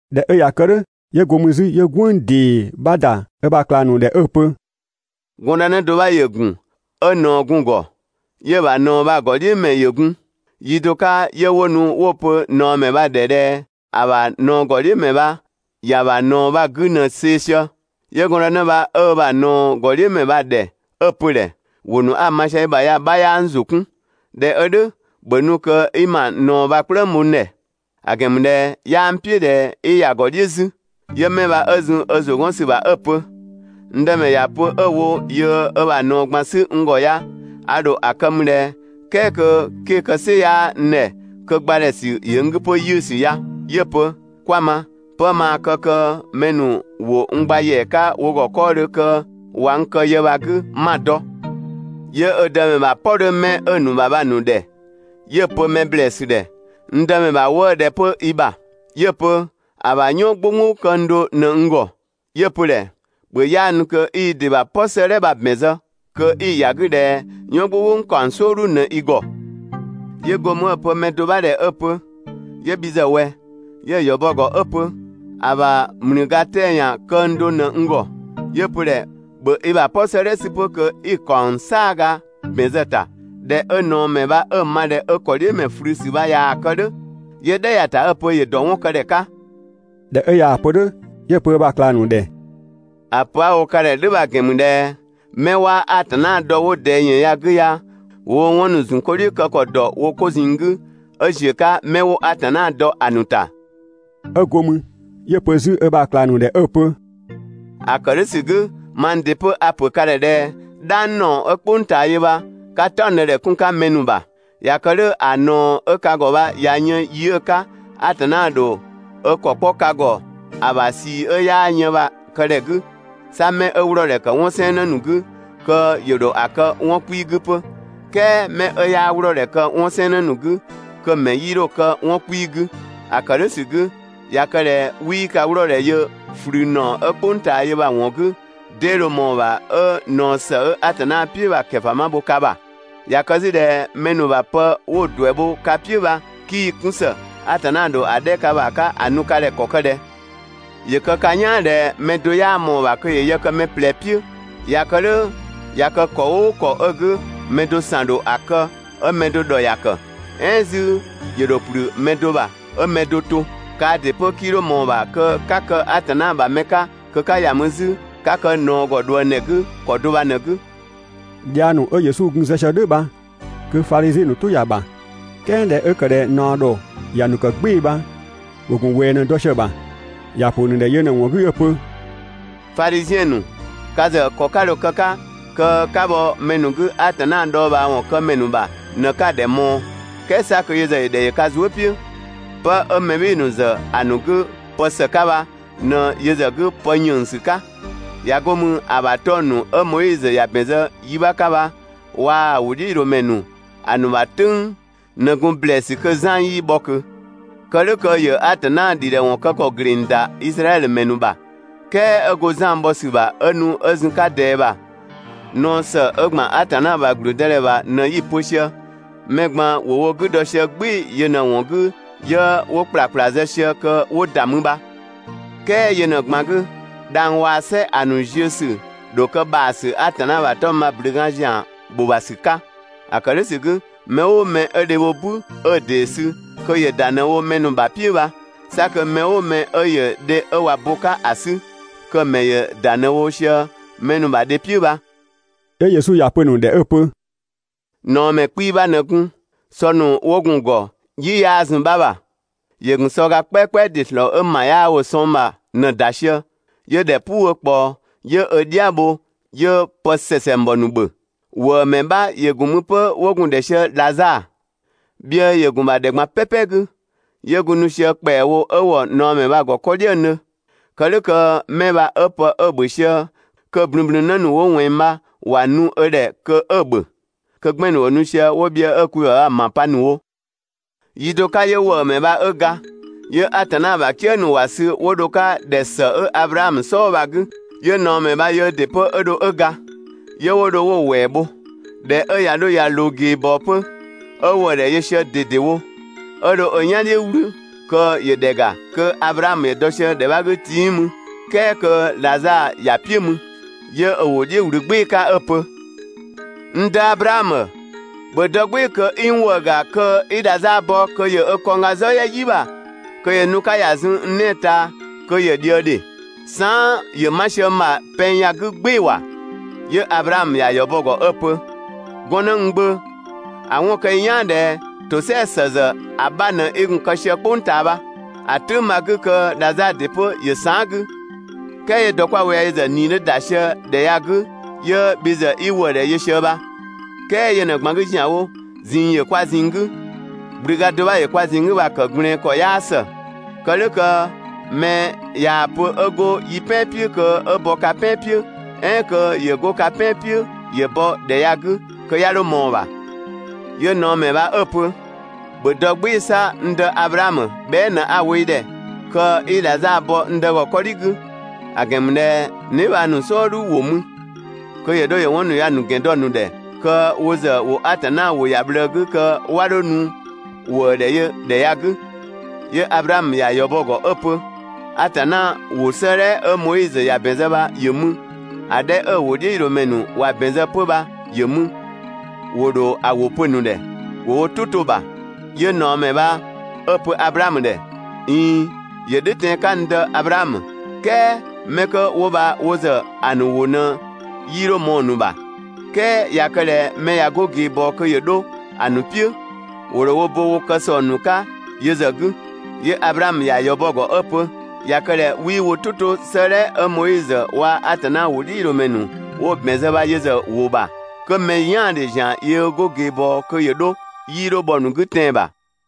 ꞊Dhɛ 'ö ꞊ya kë "dhʋ̈, 'yö go mü 'zü 'yö "gwënng ‑dee 'bha ‑da ö ‑bha ꞊klang ‑nu ‑dhɛ 'ö‑ pö: «Gɔndënë do 'bha ‑yö ‑gun, 'ö ꞊naɔ gun‑ ‑gɔ. 'Yö‑ ‑bha ꞊naɔ bha‑ ‑gɔdhiʋ̈mɛ ‑yö gun. Yi do 'ka 'yö 'wo nu 'wo‑ pö ꞊naɔmɛ bha‑ ‑dhɛ ꞊dhɛ ‑a ‑bha ꞊naɔ ‑gɔdhiʋ̈mɛ bha ‑ya ‑bha ꞊naɔ bha‑ 'gü ꞊në‑ see‑ sië. 'Yö gɔndë bha 'ö ö ‑bha ꞊naɔ ‑gɔdhiʋ̈mɛ bha‑ ‑dhɛ 'ö‑ pö‑ ‑dhɛ: «‑Wʋ ‑nu 'a‑ ma sië i ‑bha ya‑ 'bha 'yaa n ‑zʋ 'kun. ꞊Dhɛ 'ö "dhʋ̈, ‑bhö nu kö 'i ma ꞊naɔ bha‑ "kplëng bho n ‑dhɛ; ‑a ‑gɛn ‑mü ꞊dhɛ 'yaa n "piʋ̈ ꞊dhɛ 'i ‑ya ‑gɔ "dhiʋ̈ 'zü.» 'Yö 'mɛ 'bha 'ö zun ö ‑zʋ 'gɔn ‑sü ‑bha 'ö‑ pö: «N dëmɛ ‑ya pö 'ö‑ wo yöö ö ‑bha ꞊naɔ ꞊gban 'sü n ‑gɔ ya, a ‑dho ‑a kë mü ꞊dhɛ, "kɛɛ kö 'ke‑ kë "sɩ 'yaa n ‑dhɛ, kö ‑gbadhɛsü ‑yö n 'gü 'pö 'yiʋ̈sü ya?» 'Yö‑ pö: «'Kwa‑ ma, 'pë maa kë kö mɛ ‑nu ‑wo n gba ‑yɛa 'ka wo ‑gɔ 'kɔɔdhö kö ꞊wa n kë yë bha‑ 'gü 'ma‑ dɔ.» 'Yö ö dëmɛ ‑bha "pɔ 'dhö 'mɛ 'ö‑ ‑nu ‑bha bha‑ ‑nu ‑dhɛ, 'yö‑ pö mɛ ‑blɛɛsü ‑dhɛ: «N dëmɛ ‑bha 'wëë‑ ꞊dhɛ 'pö i ‑bha?» 'Yö‑ pö: «‑A ‑bha "yɔn "gbʋnggbʋ këng do ꞊në n ‑gɔ.» 'Yö‑ pö‑ ‑dhɛ: «‑Bhö 'yaanu kö 'i i ‑dɩ ‑bha "pɔ 'sëëdhɛ bha‑ ‑bɛn zë kö 'i ‑ya 'gü ꞊dhɛ "yɔn "gbʋnggbʋ ‑kaɔng "sɔɔdhu ꞊në i ‑gɔ.» 'Yö go mü 'ö‑ pö mɛ do 'bha ‑dhɛ 'ö‑ pö: «'Yö bhi ‑zë ꞊wɛ?» 'Yö‑ ‑yɔ bɔ 'pö‑ ‑gɔ 'ö‑ pö: «‑A ‑bha ‑mlüga 'tɛa‑ ‑yan këng do ꞊në n ‑gɔ.» 'Yö‑ pö‑ ‑dhɛ: «‑Bhö i ‑bha "pɔ 'sëëdhɛ 'sü 'pö kö 'i ‑kaɔng "saaga ‑bɛn zë‑ ‑ta.» ꞊Dhɛ 'ö ꞊naɔmɛ bha 'ö‑ ma ꞊dhɛ ö ‑kɔdhiʋ̈mɛ ꞊flüsü bha ꞊yaa‑ kë "dhʋ̈, 'yö "dhɛ ‑ya ‑ta 'ö‑ pö ‑yö ‑dɔ 'wɔn kë ‑dhɛ 'ka. ꞊Dhɛ 'ö Yesu ꞊yaa‑ pö "dhʋ̈, 'yö‑ pö ö ‑bha ꞊klang ‑nu ‑dhɛ: «‑A pö 'a‑ wo ka ‑dhɛ "dhʋ̈ bha‑ ‑gɛn ‑mü ꞊dhɛ 'mɛ 'waa Atanna dɔ 'wo ꞊dɛɛ ‑yën ya‑ 'gü ya, ‑wo woo‑ 'wɔn ‑nu ‑zun 'ko "dhiʋ̈ kë ‑kɔ ‑dɔ wo 'ko ꞊zinng 'gü 'ö ‑ziö 'ka 'mɛ 'wo Atanna dɔ ‑a ‑nu ‑ta.» 'Ö go mü 'yö‑ pö 'zü ö ‑bha ꞊klang ‑nu ‑dhɛ 'ö‑ pö: «‑A ‑kë "dhʋ̈ ‑sü 'gü, mang ‑dɩ 'pö a‑ ‑pö ka ‑dhɛ ꞊dhɛ: "Dhang ‑naɔ 'ö "kpʋng ꞊taa yö bha, 'ka "taɔngdëdhɛ 'kun‑ 'ka mɛ ‑nu ‑bha. ꞊Ya kë "dhʋ̈, ‑a ꞊naɔ 'ö ka ‑gɔ bha ꞊ya yën yi 'ö‑ 'ka Atanna ‑dho ö ‑kɔ 'kpɔ ka ‑gɔ ‑a ‑bha ꞊sii 'ö 'yaa yën bha‑ këdhɛ 'gü, 'sa 'mɛ 'ö 'wlɔɔdhɛ ‑kë 'wɔn 'sɛɛnnë ‑nu 'gü, kö ‑yö ‑dho ‑a kë 'wɔn 'kpii‑ 'gü 'pö, "kɛɛ mɛ 'ö 'yaa 'wlɔɔdhɛ kë 'wɔn 'sɛɛnnë 'gü, kö‑ ‑mɛ 'yii dho‑ kë 'wɔn 'kpii‑ 'gü. ‑A ‑kë "dhʋ̈ ‑sü 'gü, ꞊ya kë ꞊dhɛ 'wii ka 'wlɔɔdhɛ yö ꞊flü ‑naɔ 'ö "kpʋng ꞊taa yö bha‑ ‑wɔn 'gü, 'dee dho ꞊mɔɔ‑ ‑bha 'ö ꞊naɔ ‑së 'ö Atanna "piʋ̈ bha‑ ‑kɛfama bho ka ‑bha? ꞊Ya kë 'zü ꞊dhɛ mɛ ‑nu ‑bha pë 'wo‑ ‑duɛ bho ka "piʋ̈ bha 'kii‑ 'kun ‑së, Atanna ‑dho ‑a 'dhɛ ka ‑bha 'ka ‑a nu ka ‑dhɛ ‑kɔ ‑kë ꞊dhɛ? ‑Yö kë ka "yaan ꞊dhɛ: Mɛ do 'yaa ꞊mɔɔ‑ ‑bha kö ‑yö yë kë mɛ ꞊plɛ "piʋ̈. ꞊Ya kë "dhʋ̈, ꞊ya kë ‑kɔ "ʋʋ ‑kɔ 'ö‑ 'gü mɛ do ‑san ‑dho ‑a kë 'ö mɛ do ‑dhɔ ‑ya ‑kë. "Ɛɛn 'zü ‑yö ‑dho ‑kplü mɛ do ‑bha, 'ö‑ mɛ do to. Kaa ‑dɩ 'pö 'kii 'dho ꞊mɔɔ‑ ‑bha kö 'ka kë Atanna ‑bha mɛ 'ka kö 'ka ‑ya mü 'zü 'ka kë ꞊naɔ ‑gɔ ꞊dhuëngdhɛ 'gü ‑kɔ do bha ꞊në‑ 'gü.» Dhiang ‑nu 'ö Yesu gun‑ zë sië "dhʋ̈ bha kö Fadhiziɛn ‑nu "tʋ ‑ya ‑bha. "Kɛɛ ꞊dhɛ 'ö ‑kë ꞊dhɛ ꞊naɔ ‑dhɔ ‑ya ‑nu kë "gbɩɩ‑ bha, ‑wo ‑gun ꞊wɛɛ ꞊në‑ dɔ sië‑ ‑bha. ‑Ya ‑pö ‑nu ‑dhɛ yö ꞊në‑ ‑wɔn 'gü 'ö‑ pö: «Fadhiziɛn ‑nu, ka ‑zë ‑kɔ 'ka dho‑ kë‑ 'ka kö 'ka bhɔ mɛ ‑nu 'gü Atanna dhɔɔbhaawɔn kë ‑mɛ ‑bha ꞊në 'ka‑ ‑dhɛ ꞊mɔɔ, "kɛɛ 'sa kö yö ‑zë ‑yö ‑dhɛ yö ka zuë" "piʋ̈. 'Pë 'ö mɛ "bhɩɩ‑ ‑nu ‑zë ‑a ‑nu 'gü pë ‑së 'ka bha ꞊në yö ‑zë 'gü pë ‑yënngsü 'ka. ꞊Ya 'go mü ‑a ‑bha 'tɔng‑ ‑nu 'ö Moizö ‑ya ‑bɛn zë yi 'bha 'ka bha waa‑ ‑wʋdhiʋ̈loomɛ ‑nu ‑a ‑nu ‑bha "tʋ̈ng ꞊në gun ‑blɛɛsü kö Zan 'yii bhɔ ꞊kö. (Kë "dhʋ̈ kö ‑yö Atanna ‑dhidhɛwɔn kë ‑kɔ ‑gleng ‑da Izraɛdhö ‑mɛ ‑nu ‑bha), "kɛɛ 'ö go Zan bhɔ ‑sü ‑bha 'ö nu 'ö zun‑ 'ka ꞊dɛɛ bha, ꞊naɔ ‑së 'ö ‑gban Atanna ‑bha ‑gblüdëdhɛ ‑bha ꞊në 'yi‑ pö sië. Mɛ ꞊gban ‑wo wo 'gü dɔ sië "gbɩɩ‑ yö ꞊në‑ ‑wɔn 'gü 'yö 'wo ‑kplakpla zë sië kö 'wo ‑da mü bha. "Kɛɛ yö ꞊në‑ ꞊gban 'gü, dhang‑ waa‑ "sɛ ‑a ‑nu ziö ‑sü ‑dho kë ‑bhaasü Atanna ‑bha 'tɔng‑ bha‑ ꞊blünga ‑zian ‑go ‑bha ‑sü 'ka. ‑A ‑kë "dhʋ̈ ‑sü 'gü, mɛ "ʋʋ mɛ 'ö‑ dhe bho "bü 'ö‑ ‑dee sü kö ‑yö ‑da ꞊në‑ wo mɛ ‑nu ‑bha "piʋ̈ bha. 'Sa kö mɛ "ʋʋ mɛ 'ö ‑yö dhe 'ö ꞊wa wo bo‑ 'ka ‑a 'sü, kö‑ ‑mɛ ‑yö ‑da ꞊në wo sië mɛ ‑nu ‑bha dhe "piʋ̈ bha.» 'Yö Yesu ‑ya pö‑ ‑nu ‑dhɛ 'ö‑ pö: «꞊Naɔmɛ 'kpii‑ 'bha ꞊në gun, sɔ ‑nu 'wo gun‑ ‑gɔ, "yi 'yaa zun‑ 'bha ‑bha. ‑Yö ‑gun sɔga "kpɛakpɛa ‑dɩ ‑slɔɔ 'ö ‑ma 'yaa wo‑ sɔng ‑bha bha ꞊në‑ ‑da sië. 'Yö ‑dhɛ "puu 'ö ꞊kpaɔ, 'yö ö "dhia bho 'yö pë ‑sɛsɛngbɔ ‑nu ‑bhö. ‑Wëëmɛ 'bha ‑yö gun mü 'pö 'wo‑ gun ‑dhɛ sië Dhazaa. Bhiëë ‑yö ‑gun ‑bha ‑dhɛ ꞊gban "pɛpɛ 'gü, 'yö gun nu sië ‑kpɛawo 'ö ‑wɔ ꞊naɔmɛ bha‑ ‑gɔ 'kɔ "dhiëngdhö. Kë "dhʋ̈ kö 'mɛ bha 'ö 'pë 'ö‑ ‑bhö sië kö‑ ꞊blünblün 'në ‑nu 'wo ꞊wɛnng bha ‑wa nu ö ‑dhɛ kö 'ö‑ ‑bhö. Kö 'gbɛn‑ ‑nu ‑wo nu sië 'wo bhiëë 'ö‑ kwi ‑bha bha‑ ‑ma pa ‑nu wo. Yi do 'ka 'yö ‑wëëmɛ bha 'ö ga, 'yö Atanna ‑bha "kië ‑nu ‑wa sü 'wo dho‑ 'ka ‑dhɛ ‑së 'ö Ablaamö "sɔɔ bha‑ 'gü. 'Yö ꞊naɔmɛ bha yöö ‑dɩ 'pö 'ö dho 'ö ga. 'Yö 'wo dho 'wo‑ ‑wɛɛ bho. ꞊Dhɛ 'ö ꞊ya 'dho ꞊ya ꞊loo ꞊geebɔɔ 'pö, 'ö ‑wëëdhɛ yö sië mü ꞊dedewo, 'ö dho ö "yan "dhiʋ̈ "wlü kö ‑yö ‑dhɛ ‑ga, kö Ablaamö ‑yö dɔ sië ‑dhɛ 'bha 'gü 'tiii mü, "kɛɛ kö Dhazaa ‑ya "piʋ̈ mü. 'Yö ö ‑wʋ "dhiʋ̈ ꞊wlü "gbɩɩ‑ 'ka 'ö‑ pö: «N dë Ablaamö, ‑bhö dɔ "gbɩɩ‑ kö 'i n ‑wëë ‑ga kö 'i Dhazaa bɔ kö ‑yö ö kɔngga "zɔ "yɛ "yi ‑bha kö ‑yö nu‑ 'ka ‑ya zun n 'nɛɛ‑ ꞊taa kö ‑yö ꞊dhië ‑dhe! Saan" ‑yö 'ma sië n ‑bha pɛng ya‑ 'gü "gbɩɩ‑ ‑wa!» 'Yö Ablaamö ‑ya ‑yɔ bɔ‑ ‑gɔ 'ö‑ pö: «Gɔnnë n gbö, ‑a 'wɔn kë i "yaan ꞊dhɛ ‑tosɛa ‑së ‑zë ‑a 'bha ꞊në 'i gun‑ kë sië "kpʋng ꞊taa bha. ‑A "tʋ̈ng bha‑ 'gü kö Dhazaa ‑dɩ 'pö ‑yö saan" 'gü, "kɛɛ 'yö dɔ 'kwa‑ wo ya yö ‑zë ꞊nii 'dhö ‑da sië ‑dhɛ ya‑ 'gü 'yö bhi ‑zë 'i ‑wëëdhɛ yö sië bha. "Kɛɛ yö ꞊në‑ ꞊gban 'gü ‑zianwo, ꞊zinng ‑yö kwa ꞊zinng 'gü, ꞊gblüga do 'bha ‑yö kwa ꞊zinng 'gü bha‑ ‑kë ꞊gblɛɛn ‑kɔ 'yaa ‑së. Kë "dhʋ̈ kö mɛ ꞊yaa‑ pö 'ö 'go yi "pɛan "piʋ̈ kö 'ö bɔ ka "pɛan "piʋ̈, "ɛɛn kö ‑yö 'go ka "pɛan "piʋ̈ ‑yö bɔ ‑dhɛ ya‑ 'gü, kö 'ya 'dho ꞊mɔɔ‑ ‑bha.» 'Yö ꞊naɔmɛ bha 'ö‑ pö: «‑Bhö dɔ "gbɩɩ‑ 'sa, n dë Ablaamö, bhɛa" ꞊në 'a‑ wo i ‑dhɛ kö 'i Dhazaa bɔ n dë ‑gɔ 'kɔdhi 'gü, ‑a ‑gɛn ‑mü ꞊dhɛ n dheebhang ‑nu "sɔɔdhu ‑wo mü. Kö ‑yö 'dho ‑yö 'wɔn ‑nu ya‑ ‑nu ‑gɛn dɔ‑ ‑nu ‑dhɛ kö wo ‑zë ‑wo Atanna ‑wʋ ‑ya ꞊bhlëë 'gü kö 'wa 'dho nu ‑wëëdhɛyödhɛ ya‑ 'gü.» 'Yö Ablaamö ‑ya ‑yɔ bɔ‑ ‑gɔ 'ö‑ pö: «Atanna ‑wʋ 'sëëdhɛ 'ö Moizö ‑ya ‑bɛn zë bha ‑yö mü, ‑a 'dhɛ 'ö‑ ‑wʋdhiʋ̈loomɛ ‑nu ‑wa ‑bɛn zë 'pö bha ‑yö mü, ‑wo ‑dho ‑a ‑wʋ pö‑ ‑nu ‑dhɛ, ‑wo wo "tʋ 'to‑ ‑bha!» 'Yö ꞊naɔmɛ bha 'ö‑ pö Ablaamö ‑dhɛ: «(꞊Iin, ‑yö "dhʋ̈ tɛan‑ 'ka n dë Ablaamö,) "kɛɛ 'mɛ 'kö 'wo bha wo ‑zë ‑a ‑nu ‑wʋ ꞊në 'yii 'dho ꞊mɔɔ‑ ‑nu ‑bha. "Kɛɛ ꞊ya kë ꞊dhɛ mɛ ꞊ya 'go ꞊geebɔɔ kö ‑yö 'dho ‑a ‑nu "piʋ̈, ‑wo ‑dho wo bo wo kë ‑sɔng ‑nu 'ka yö ‑zë 'gü.» 'Yö Ablaamö ‑ya ‑yɔ bɔ‑ ‑gɔ 'ö‑ pö: «꞊Ya kë ꞊dhɛ 'wii wo "tʋ to 'sëëdhɛ 'ö Moizö waa‑ Atanna ‑wʋdhiʋ̈loomɛ ‑nu 'wo‑ ‑bɛn zë bha yö ‑zë ‑wʋ ‑bha, 'kö mɛ "yaandhe ‑zian yöö 'go ꞊geebɔɔ kö ‑yö 'dho, 'yii 'dho bhɔ‑ ‑nu 'gü tɛan‑ ‑bha.»